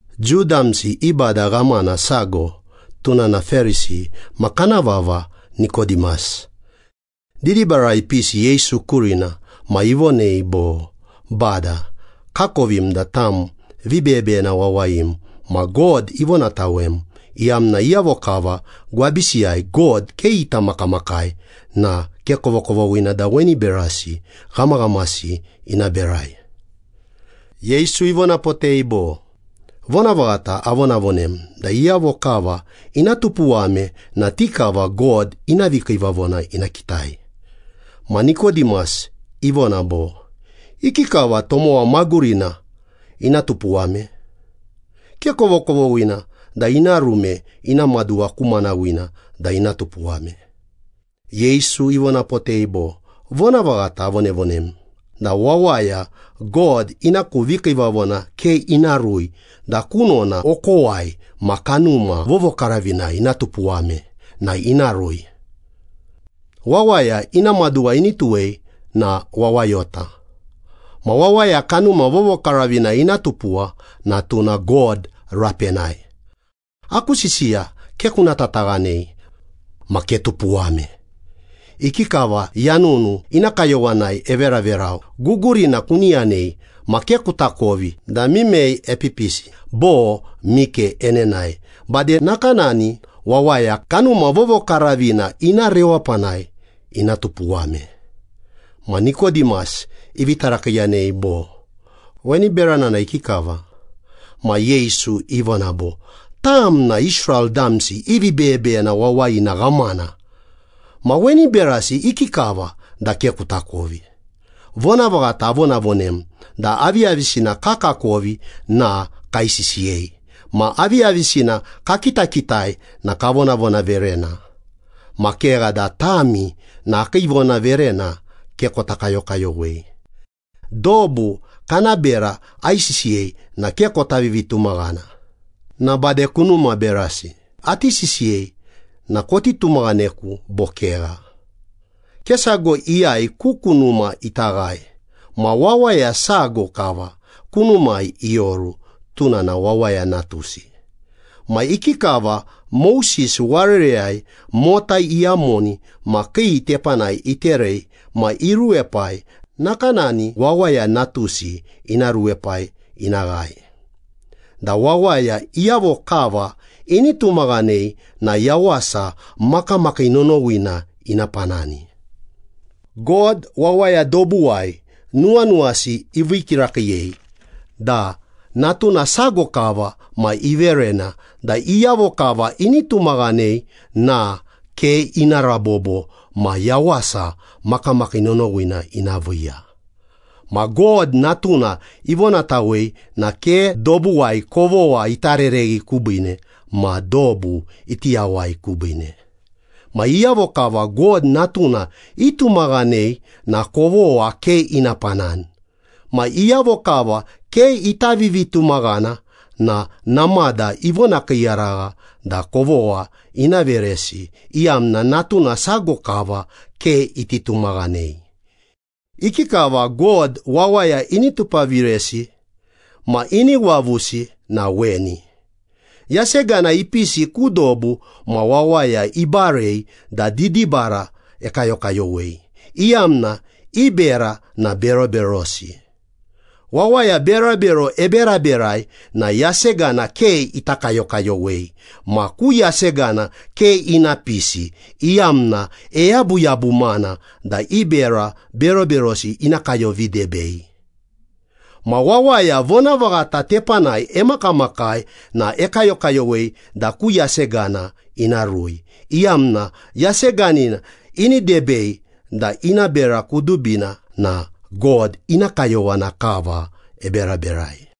Jiu damsi i bada ghamana sago, tuna na Perisi ma kana vava Nikodimas. Didibarai ipisi Yesu kurina ma ivonei bo, “Bada, kakovim da tam vibeyebeyena wawayim ma God ivonatawem, iyamna iyavo kava gwabisiyai God ke ita makamakai na ke kovokovoghina da weni berasi ghamaghamasi ina berai.” Yesu ivonapotei bo, “Vonavaghata avonavonem da iyavo kava ina tupuwame na ti kava God ina vikiivavona ina kitai.” Ma Nikodimas ivona bo, “Ikikava tomowa magurina ina tupuwame? Ke kovokovoghina da ina ruime ina maduwa ku manawina da ina tupuwame!” Yesu ivonapotei bo, “Vonavaghata avonavonem da wawaya God ina ku vikiivavona ke ina rui da kunona okowai ma Kanuma Vovokaravinai ina tupuwame na ina rui. Wawaya ina maduwa ini tuwei na wawayota. Ma wawaya Kanuma Vovokaravinai ina tupuwa na tuna God rapenai. Aku sisiya ke kuna tataghanei. Ma ketupuwame. Ikikava yanunu ina kayowanai everaverau, gugurina kuni yanei ma ke kutakovi da mimei epipisi bo mike enenae, bade nakanani wawaya Kanuma Vovokaravina ina rewapanai ina tupuwame.” Ma Nikodimas ivi tarakiiyanei bo, “Weni berana na ikikava?” Ma Yesu ivona bo, “Tam na Israel damsi i vibeyebeyena wawayina ghamana. Ma weni berasi ikikava na ke kutakovi? Vonavaghata avonavonem da aviyavisina kakakovi na kaisisiyei, ma aviyavisina kakitakitai na kavonavonaverena. Ma kegha da tami na akii vonaverena ke kota kayokayowei. Dobu kana bera aisisiyei na ke kota vivitumaghana, na bade kunuma berasi ati sisiyei na koti tumaghaneku bo kegha? Ke sago iyai ku kunuma ita ghae, ma wawaya sago kava kunumai ioru, tuna na Wawaya Natusi.” “Ma ikikava Moses warereyai mota iyamoni ma kii tepanai iterei ma iruepai, nakanani Wawaya Natusi ina ruepai ina ghae, da wawaya iyavo kava ini tumaghanei na yawasa makamakii nonowina ina panani. God wawaya dobuwai nuwanuwasi ivii kirakiiyei da Natuna sago kava ma iverena da iyavo kava ini tumaghanei na ke ina rabobo ma yawasa makamakii nonowina ina viiya. Ma God Natuna ivonatawei na ke dobuwai kovogha ita rereghi kubiine ma dobu iti yawai kubiine.” “Ma iyavo kava God Natuna itumaghanei na kovogha ke ina panani. Ma iyavo kava ke ita vivitumaghana na namada ivonakiiyaragha da kovogha ina veresi, iyamna Natuna sago kava ke iti tumaghanei. Ikikava God wawaya ini tupaviresi ma ini wavusi na weni. Yasegana ipisi ku dobu, ma wawaya ibarei da didibara ekayokayowei, iyamna i bera na beroberosi. Wawaya berabero eberaberai na yasegana ke ita kayokayowei, ma ku yasegana ke ina pisi, iyamna eyabuyabumana da i bera beroberosi ina kayovidebei. Ma wawaya vonavaghata tepanai emakamakai na ekayokayowei da ku yasegana ina rui, iyamna yaseganina ini debei da ina bera kudubina na God ina kayowana kava eberaberai.”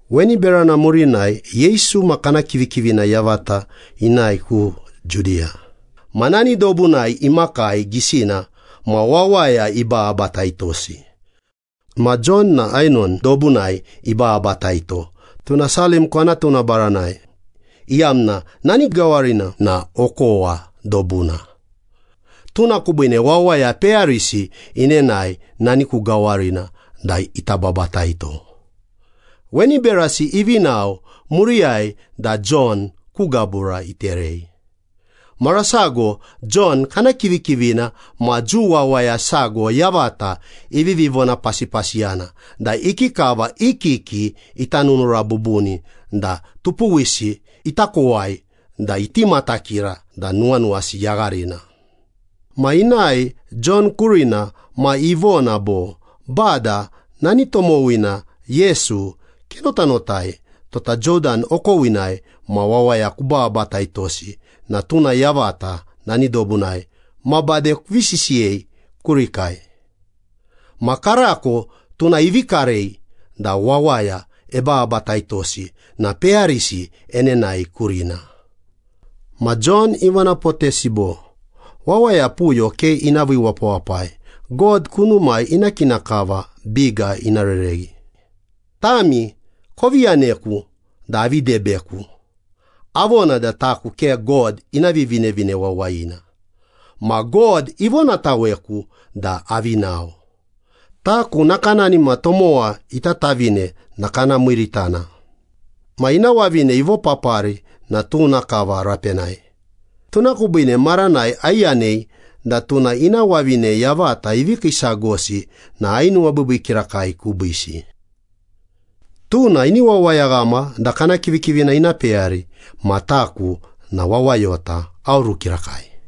Weni berana murinai Yesu ma kana kivikivina yavata inae ku Judiya, ma nani dobunai imakii gisina ma wawaya ibababataitosi. Ma Jon na Ainon dobunai ibababataito. Tuna Salim kwanatuna baranai, iyamna nani gawarina na okowa dobuna. Tuna kubiine wawaya peyarisi inenae nani ku gawarina da ita babataito. Weni berasi ivi nao, muriyai da Jon ku gabura iterei. Mara sago Jon kana kivikivina ma Jiu wawaya sago yavata ivivi vonapasipasiyana da ikikava i kiki ita nunura bubuni da tupuwisi ita kowai da iti matakira da nuwanuwasi yagharina. Ma inae Jon kurina ma ivona bo, “Bada, nani tomowina Yesu kenotanotai, tota Jodan okowinai ma wawaya kubababataitosi na tuna yavata nani dobunai ma bade kuvi sisiyei kurikai. Ma karako tuna ivi karei da wawaya ebababataitosi na peyarisi enenae kurina.” Ma Jon ivonapotesi bo, “Wawaya puyo ke ina vii wapawapai. God kunumai ina kina kava biga ina rereghi. Tami kovi yaneku da avi debeku, avona da taku ke God ina Vivinevine Wawayina. Ma God ivonataweku da avi nao. Taku nakanani ma tomowa ita tavine na kana miiritana. Ma ina wavine ivopapari na tuna kava rapenai. Tuna kubiine maranai aiyanei da tuna ina wavine yavata ivi kiisagosi na ainuwabiibii kirakai kubiisi. Tuna ini wawayaghama da kana kivikivina ina peyari ma taku na wawayota, aoru kirakai.”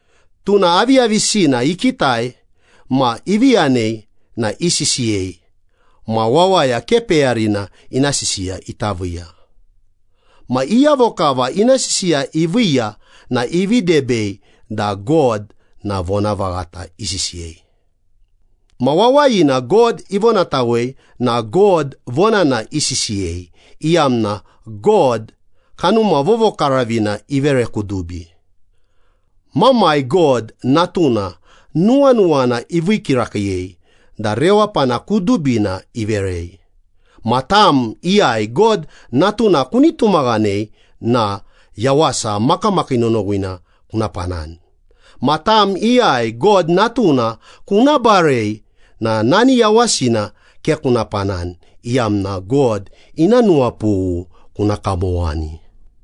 Tuna aviyavisina ikitai ma ivi yanei na isisiyei ma wawaya ke peyarina ina sisiya ita viiya. Ma iyavo kava ina sisiya iviiya na ivi debei da God na vonavaghata isisiyei. Ma wawayina God ivonatawei na God vonana isisiyei, iyamna God, Kanuma Vovokaravina ivere kudubi. Mamai God, Natuna nuwanuwana ivii kirakiiyei da rewapana kudubina iverei. Ma tam iyai God Natuna kuni tumaghanei na yawasa makamakii nonowina kuna panani. Ma tam iyai God Natuna kuna barei na nani yawasina ke kuna panani, iyamna God ina nuwapughu kuna kamowani.